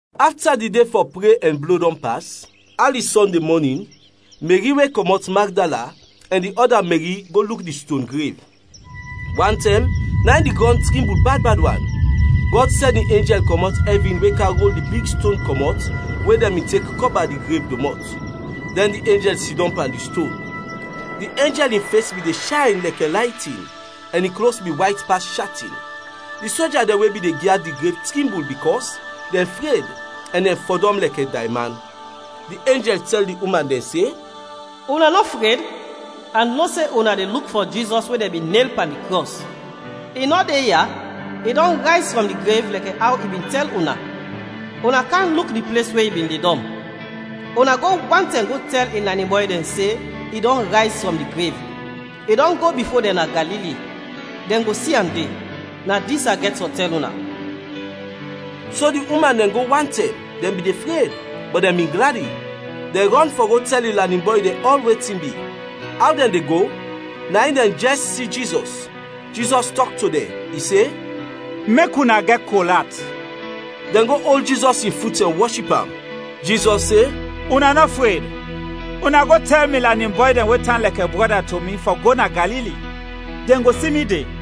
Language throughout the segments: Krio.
Afta di de fɔ pre ɛn blo dɔn pas, ali Sɔnde mɔnin, Meri we kɔmɔt Magdala, ɛn di ɔda Meri go luk di ston grev. Wantɛm, na in di grɔn trimbul bad bad wan; Gɔd sɛn in enjɛl kɔmɔt ɛvin we kam rol di big ston kɔmɔt we dɛn bin tek kɔba di grev domɔt, dɛn di enjɛl sidɔm pan di ston. Di enjɛl in fes bin de shayn lɛkɛ laytin ɛn in klos bin wayt pas shatin. Di soja dɛn we bin de gyad di grev trimbul bikɔs dɛn fred ɛn dɛn fɔdɔm lɛkɛ dayman. Di enjɛl tɛl di uman dɛn se, “Una nɔ fred, a no se una de luk fɔ Jizɔs we dɛn bin nel pan di krɔs. I nɔ de ya, i dɔn rayz frɔm di grev, lɛkɛ aw i bin tɛl una. Una kam luk di ples we i bin ledɔm. Una go wantɛm go tɛl in lanin bɔy dɛn se, i dɔn rayz frɔm di grev. I dɔn go bifo dɛn na Galili, dɛn go si am de. Na dis a gɛt fɔ tɛl una.” So di uman dɛn go wantɛm, dɛn bin de fred, bɔt dɛn bin gladi. Dɛn rɔn fɔ go tɛl in lanin bɔy dɛn ɔl wetin bi. Aw dɛn de go, na in dɛn jɛs si Jizɔs. Jizɔs tɔk to dɛn. I se, “Mek una gɛt kol at.” Dɛn go ol Jizɔs in fut ɛn wɔship am. Jizɔs se, “Una nɔ fred, una go tɛl mi lanin bɔy dɛn we tan lɛkɛ brɔda to mi fɔ go na Galili, dɛn go si mi de.”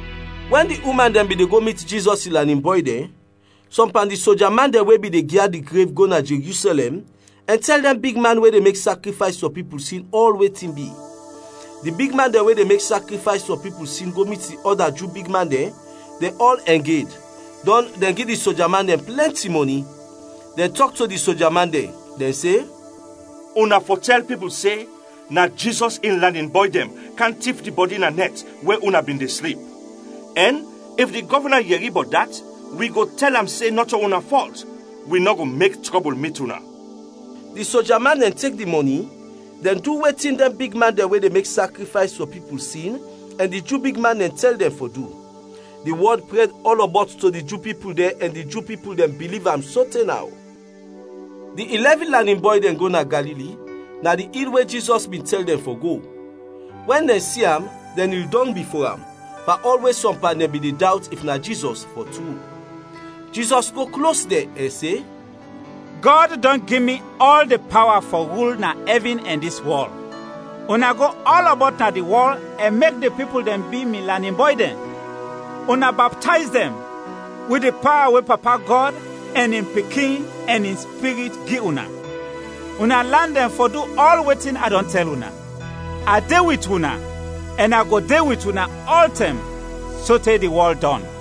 Wɛn di uman dɛn bin de go mit Jizɔs in lanin bɔy dɛn, sɔm pan di soja man dɛn we bin de gyad di grev go na Jerusɛlɛm ɛn tɛl dɛn bigman we de mek sakrifays fɔ pipul sin ɔl wetin bi. Di bigman dɛn we de mek sakrifays fɔ pipul sin go mit di ɔda Ju bigman dɛn, dɛn ɔl ɛng ed, dɔn dɛn gi di soja man dɛn plɛnti mɔni. Dɛn tɔk to di soja man dɛn, dɛn se, “Una fɔ tɛl pipul se, na Jizɔs in lanin bɔy dɛn kam tif di bɔdi na nɛt, we una bin de slip. Ɛn if di gɔvna yɛri bɔt dat, wi go tɛl am se nɔto una fɔlt. Wi nɔ go mek trɔbul mit una.” Di soja man dɛn tek di mɔni, dɛn du wetin dɛn bigman dɛn we de mek sakrifays fɔ pipul sin ɛn di Ju bigman dɛn tɛl dɛn fɔ du. Di wɔd prɛd ɔlɔbɔt to di Ju pipul dɛn ɛn di Ju pipul dɛn biliv am sote naw. Di ilɛvin lanin bɔy dɛn go na Galili, na di il we Jizɔs bin tɛl dɛn fɔ go. Wɛn dɛn si am, dɛn nil dɔng bifo am, pan ɔl we sɔm pan dɛn bin de dawt if na Jizɔs fɔ tru. Jizɔs go klos dɛn ɛn se, “Gɔd dɔn gi mi ɔl di pawa fɔ rul na ɛvin ɛn dis wɔl. Una go ɔlɔbɔt na di wɔl ɛn mek di pipul dɛn bi mi lanin bɔy dɛn; una baptayz dɛn wit di pawa we Papa Gɔd ɛn in Pikin ɛn in Spirit gi una. Una lan dɛn fɔ du ɔl wetin a dɔn tɛl una. A de wit una ɛn a go de wit una ɔltɛm sote di wɔl dɔn.”